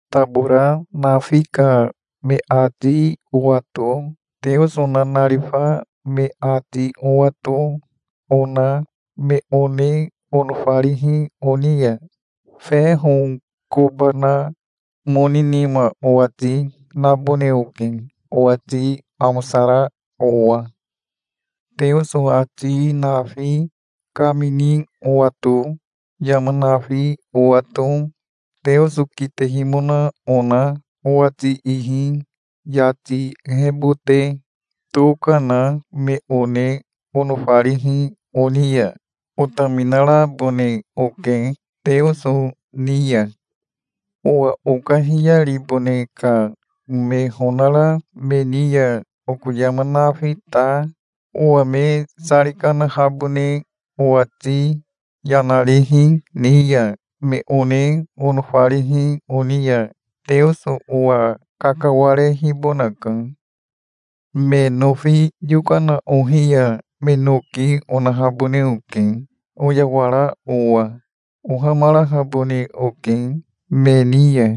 Tabora nafi ka me ati owato, Teoso nanarifa me ati owato, ona me one onofarihi oni ya feho koba na moni nima owati nabone oke, owati amosara owa. Teoso ati nafi kamini owato, yama nafi owato, Teoso kitehimona ona owati ihi yati ehebote toka na me one onofarihi oni ya otaminarabone oke Teoso ni ya. Owa okahiyaribone ka me honara me ni ya oko yama nafi ta, owa me sari kanahabone owati yana rihi ni ya, me one onofarihi oni ya Teoso owa kakawarehibonaka. Me nofi yokana ohi ya me noki onahabone oke, oyawara owa. Ohamarahabone oke me ni ya.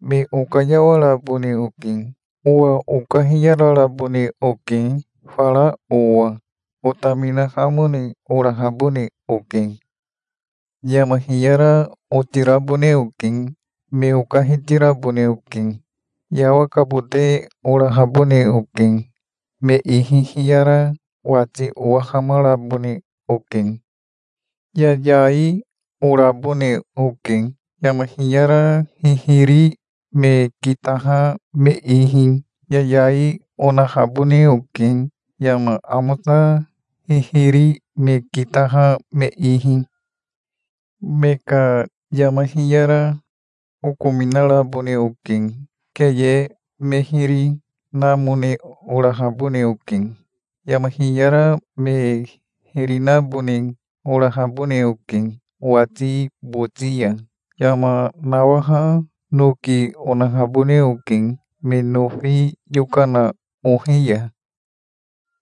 Me okayawarabone oke. Owa okahiyararabone oke fara owa. Otaminahamone orahabone oke. Yama hiyara otirabone oke. Me okahitirabone oke. Yawakabote orahabone oke. Me ihi hiyara wati owahamarabone oke. Yayai orabone oke, yama hiyara hihiri me kitaha me ihi. Yayai onahabone oke, yama amosa hihiri me kitaha me ihi. Me ka yama hiyara okominarabone oke. Keye me hiri namone orahabone oke. Yama hiyara me hiri nabone orahabone oke owati boti ya. Yama nawaha noki onahabone oke, me nofi yokana ohi ya.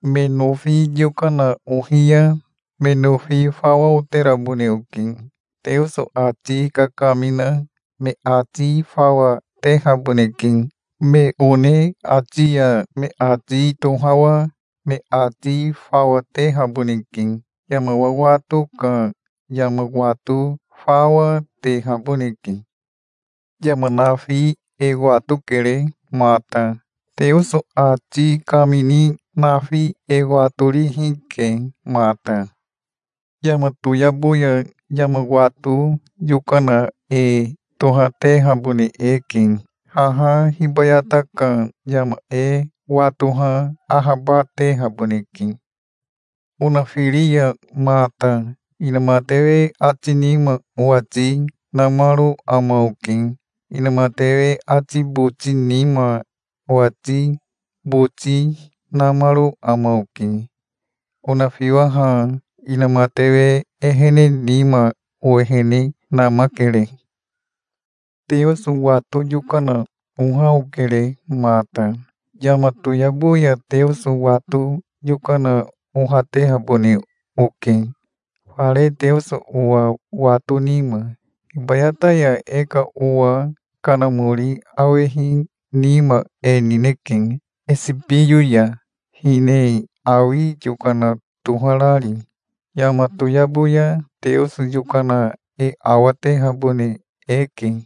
Me nofi yokana ohi ya me nofi fawa oterabone oke. Teoso ati kakamina me ati fawa tehaboneke. Me one ati ya me ati tohawa me ati fawa, tehaboneke. Yama wawato ka yama wato fawa, tehaboneke. Yama nafi e watokere mata. Teoso ati kamini nafi e watorihi ke mata. Yama toyabo ya yama wato yokana e tohatehabone eke. Haha hibayata ka yama e watoha ahabatehaboneke. Onafiri ya mata inamatewe ati nima owati namaro ama oke. Inamatewe ati boti nima owati boti namaro ama oke. Onafiwaha inamatewe ehene nima owehene namakere. Teoso wato yokana oha okere mata. Yama toyabo ya Teoso wato yokana ohatehabone oke, fare Teoso owa wato nima. Hibayata ya e ka owa kanamori awehi nima e nineke, esibiyo ya, hine awi yokana toharari. Yama toyabo ya Teoso yokana e awatehabone eke.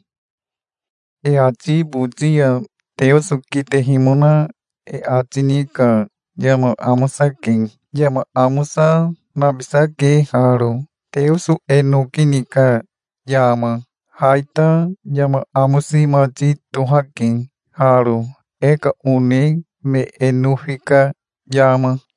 E ati boti ya Teoso kitehimona e ati ni ka yama amosake. Yama amosa, nabisake haro, Teoso e noki ni ka yama. Ha ita yama amosi mati tohake haro, e ka one me e nofi ka yama.